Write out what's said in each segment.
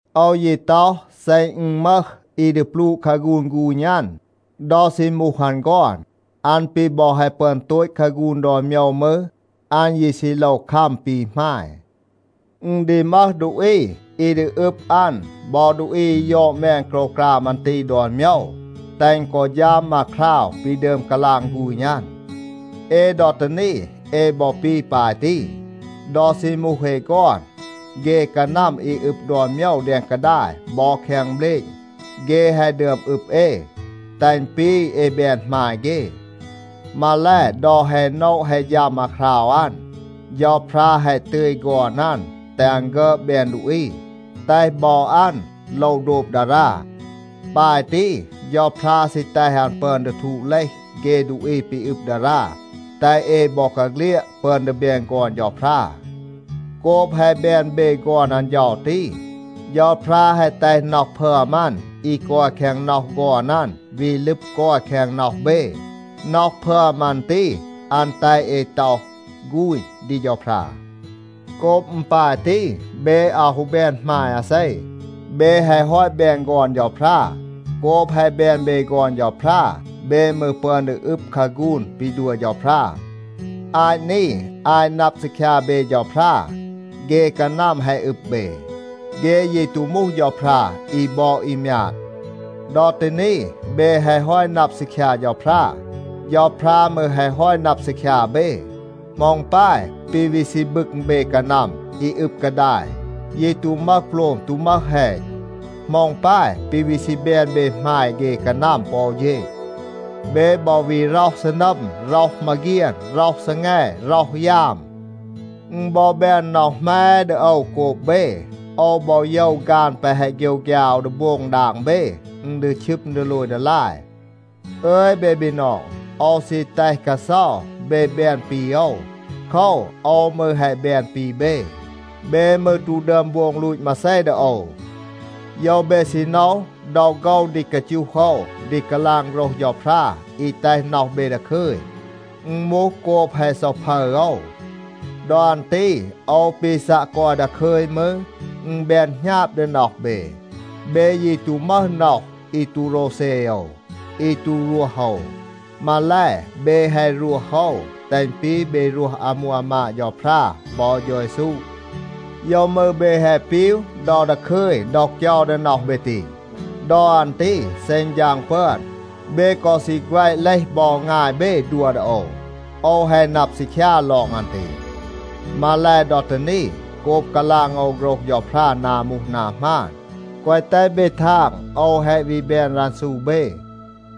โอว ยี ต็อห, เซ อึณ มึห อี ดี ปลูะ คาฆูน ฆูณ อัน, ดอ ซี มูห อัน ฆอน, อัน ปี บอ แฮะ ปึอน โตต คาฆูน ดอน โมยว มืร, อัน ยี ซี โลว คัม ปี หมาย. อึณ ดี มึห ดูอี อี อึบ อัน บอ ดูอี อี ยอด แมน โกรวกราม อัน ตี ดอน โมยว, แตห อึณ กอ ฌัม อาคราว ปี ดึอม กาลาง ฆูณ อัน. เอ ดอ ตี นี, เอ บอ ปี ปาย ตี. ดอ ซี มูห เอ ฆอน, เฆ กานัม อี อึบ ดอน โมยว แดง กาดาย บอ แคง เบลณ, เฆ แฮะ ดึอม อึบ เอ, แตห อึณ ปี เอ แบน หมาย เฆ. มาแล, ดอ แฮะ โนะ แฮะ ฌัม อาคราว อัน, เฌาพรา แฮะ ตึย ฆอน อัน แตห อัน ฆึอด แบน ดูอี. แตห บอ อัน โลว โดบ ดารา. ปาย ตี, เฌาพรา ซี แตห อัน ปึอน ดี ทูด เลห เฆ ดูอี ปี อึบ ดารา, แตห เอ บอกาเฆลียด ปึอน ดี แบน ฆอน เฌาพรา. โกบ แฮะ แบน เบ ฆอน อัน เฌา ตี, เฌาพรา แฮะ แตห น็อห พึอม อัน อี กอย แคง น็อห ฆอน อัน วี ลึบ กอย แคง น็อห เบ. น็อห พึอม อัน ตี, อัน แตห เอ ต็อห, “ฆูณ” ดี เฌาพรา. โกบ อึณ ปาย ตี, เบ อาว ฮู แบน หมาย อาเซ. เบ แฮะ ฮอต แบน ฆอน เฌาพรา. โกบ แฮะ แบน เบ ฆอน เฌาพรา, เบ มืร ปึอน ดี อึบ คาฆูน ปี ดัว เฌาพรา. อาต นี, อาต นับ ซีคยา เบ เฌาพรา, เฆ กานัม แฮะ อึบ เบ. เฆ ยี ตู มูห เฌาพรา อี บอด อี มยาด. ดอ ตี นี, เบ แฮะ ฮอต นับ ซีคยา เฌาพรา. เฌาพรา มืร แฮะ ฮอต นับ ซีคยา เบ. เหมา อึณ ปาย ปี วี ซี บึง เบ กานัม อี อึบ กาดาย, ยี ตู มึห โปลม, ตู มึห แฮณ? เหมา อึณ ปาย ปี วี ซี แบน เบ หมาย เฆ กานัม ปอ อู เฌณ? เบ บอ วี ร็อห ซีนัม, ร็อห มาเฆียน, ร็อห ซีแง, ร็อห ยาม. อึณ บอ แบน น็อห แหม ดี โอว โกบ เบ. โอว บอ โยว ฆาน แปะ แฮะ โฆยวฆยา โอว ดี โบง ดาง เบ, อึณ ดี ชึม ดีโลย ดีลาย. อึย เบ บีนอง, โอว ซี แตห กาเซา เบ แบน ปี โอว. โคว, โอว มืร แฮะ แบน ปี เบ. เบ มืร ตู ดึอม โบง ลูต มาเซ ดี โอว. โยว เบ ซี โนว, ดอ โฆว ดี กาจูห โอว ดี กาลาง โฆรห เฌาพรา อี แตห น็อห เบ ดาคึย, อึณ มูห โกบ แฮะ เซาพึร โอว. ดอ อัน ตี โอว ปี ซัะ กอย ดาคึย มืร, อึณ แบน หณาบ ดี น็อห เบ. เบ ยี ตู มึห น็อห อี ตู โรวเซ โอว, อี ตู รวห โอว. มาแล, เบ แฮะ รวห โอว, แตห อึณ ปี เบ รวห อามู อามาด เฌาพรา บอ เฌา เยซู. โยว มืร เบ แฮะ ปีว ดอ ดาคึย ดอ เกยา ดี น็อห เบ ตี? ดอ อัน ตี เซ อึณ ฌาง ปึอน, เบ กอ ซี แฆวะ เลห บอ งาย เบ ดัว ดี โอว. โอว แฮะ นับ ซีคยา ลอง อัน ตี. มาแล, ดอ ตี นี, โกบ กาลาง โอว โฆรห เฌาพรา นา มูห นา หมาน, แกวะ แตห เบ ทาง, โอว แฮะ วี แบน รันซู เบ.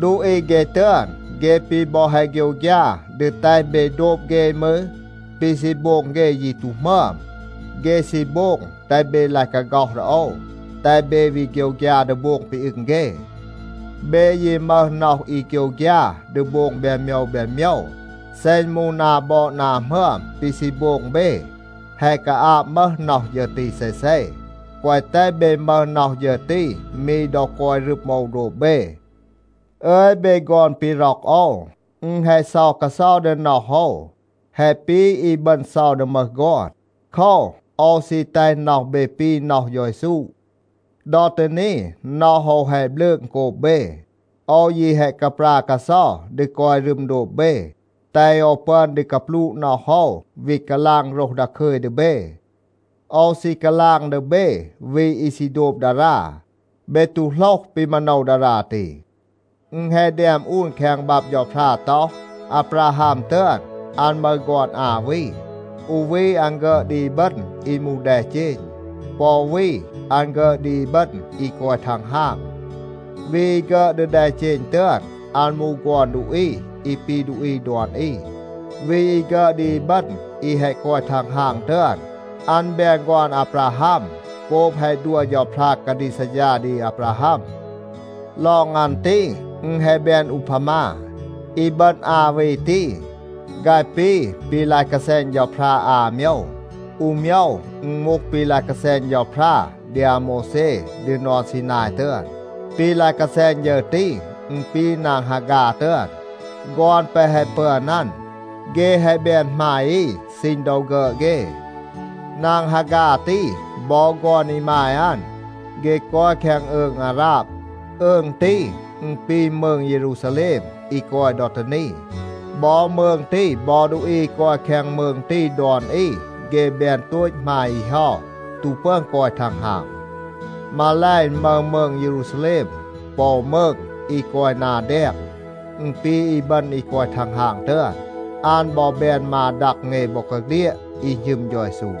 ดูอี เฆ ตึอน, เฆ ปี บอ แฮะ โฆยวฆยา ดี แตห เบ โดบ เฆ มืร, ปี ซี โบง เฆ ยี ตู หมึอม. เฆ ซี โบง แตห เบ ลาย กาฆ็อห ดี โอว, แตห เบ วี โฆยวฆยา ดี โบง ปี อึง เฆ. เบ ยี มึห น็อห อี โฆยวฆยา ดี โบง แบน โมยว แบน โมยว. เซ อึณ มูห นา บอด นา หมึอม ปี ซี โบง เบ, แฮะ กาอาบ มึห น็อห ฌึร ตี เซเซ. แกวะ แตห เบ มึห น็อห ฌึร ตี มี ดอ กอย รึม โอว โดบ เบ. อึย เบ ฆอน ปี ร็อก โอว, อึณ แฮะ เซา กาเซา ดี น็อห โอว, แฮะ ปี อีบึณ เซา ดี มึห ฆอน. โคว, โอว ซี แตห น็อห เบ ปี น็อห เฌา เยซู. ดอ ตี นี, น็อห โอว แฮะ บลืง โกบ เบ. โอว ยี แฮะ กาปรา กาเซา ดี กอย รึม โดบ เบ, แตห โอว ปึอน ดี กาปลูะ น็อห โอว, วี กาลาง โฆรห ดาคึย ดี เบ. โอว ซี กาลาง ดี เบ วี อี ซี โดบ ดารา. เบ ตู โหลห ปี มาโนว ดารา ตี. อึณ แฮะ แดม อูน แคง บับ เฌาพรา ต็อห, อาบราฮัม ตึอน, อัน มึห ฆอน อา วี. อู วี อัน ฆึอด ดี อีบึณ อี มูห แดเจณ. ปอ อู วี อัน ฆึอด ดี อีบึณ อี กอย ทังฮาง. วี อี ฆึอด ดี แดเจณ ตึอน, อัน มูห ฆอน ดูอี อี ปี ดูอี ดอน อี. วี อี ฆึอด ดี อีบึณ อี แฮะ กอย ทังฮาง ตึอน, อัน แบน ฆอน อาบราฮัม โกบ แฮะ ดัว เฌาพรา กาดีก ซัดฌา ดี อาบราฮัม. ลอง อัน ตี, อึณ แฮะ แบน อูพามา. อีบึณ อา วี ตี, ฆาย ปี ปี ลาย กาแซณ เฌาพรา อา โมยว. อู โมยว อึณ มูห ปี ลาย กาแซณ เฌาพรา ดี อาโมวแซ ดี นอน ซีนาย ตึอน. ปี ลาย กาแซณ ฌึร ตี, อึณ ปี นาง ฮาฆา ตึอน. ฆอน แปะ แฮะ ปึอน อัน, เฆ แฮะ แบน หมาย อี ซีณ ดอ ฆึอด เฆ. นาง ฮาฆา ตี บอ ฆอน อีมาย อัน, เฆ กอย แคง อืง อาราบ. อืง ตี, อึณ ปี มืง เยรูซาแลม อี กอย ดอ ตี นี. บอ มืง ตี บอ ดูอี อี กอย แคง มืง ตี ดอน อี, เฆ แบน โตต หมาย อี เฮา, ตู ปึอน กอย ทังฮาง. มาแล, อึณ มึห มืง เยรูซาแลม ปอ อู มืง อี กอย นา แดง. อึณ ปี อีบึณ อี กอย ทังฮาง ตึอน. อัน บอ แบน มา ดัง เอ บอกาเฆลียด, อี หณึม เฌา เยซู.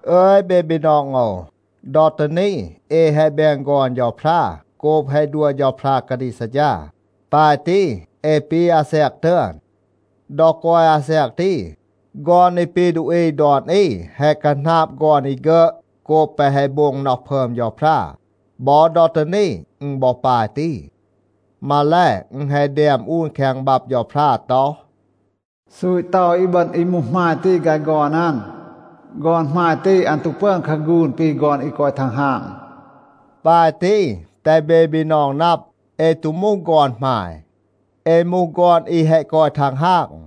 อึย เบ บีนอง โอว, ดอ ตี นี เอ แฮะ แบน ฆอน เฌาพรา โกบ แฮะ ดัว เฌาพรา กาดีก ซัดฌา. ปาย ตี, เอ ปี อาแซก ตึอน. ดอ กอย อาแซก ตี, ฆอน อี ปี ดูอี ดอน อี แฮะ คาหนาบ ฆอน อี ฆึอด โกบ แปะ แฮะ โบง น็อห พึอม เฌาพรา. บอ ดอ ตี นี, อึณ บอ ปาย ตี. มาแล, อึณ แฮะ แดม อูน แคง บับ เฌาพรา ต็อห, “ซูต เตา อีบึณ อี มูห หมาย ตี ฆาย ฆอน อัน. ฆอน หมาย ตี, อัน ตู ปึอน คาฆูน ปี ฆอน อี กอย ทังฮาง.” ปาย ตี, แตห เบ บีนอง นับ, เอ ตู มูห ฆอน หมาย. เอ มูห ฆอน อี แฮะ กอย ทังฮาง.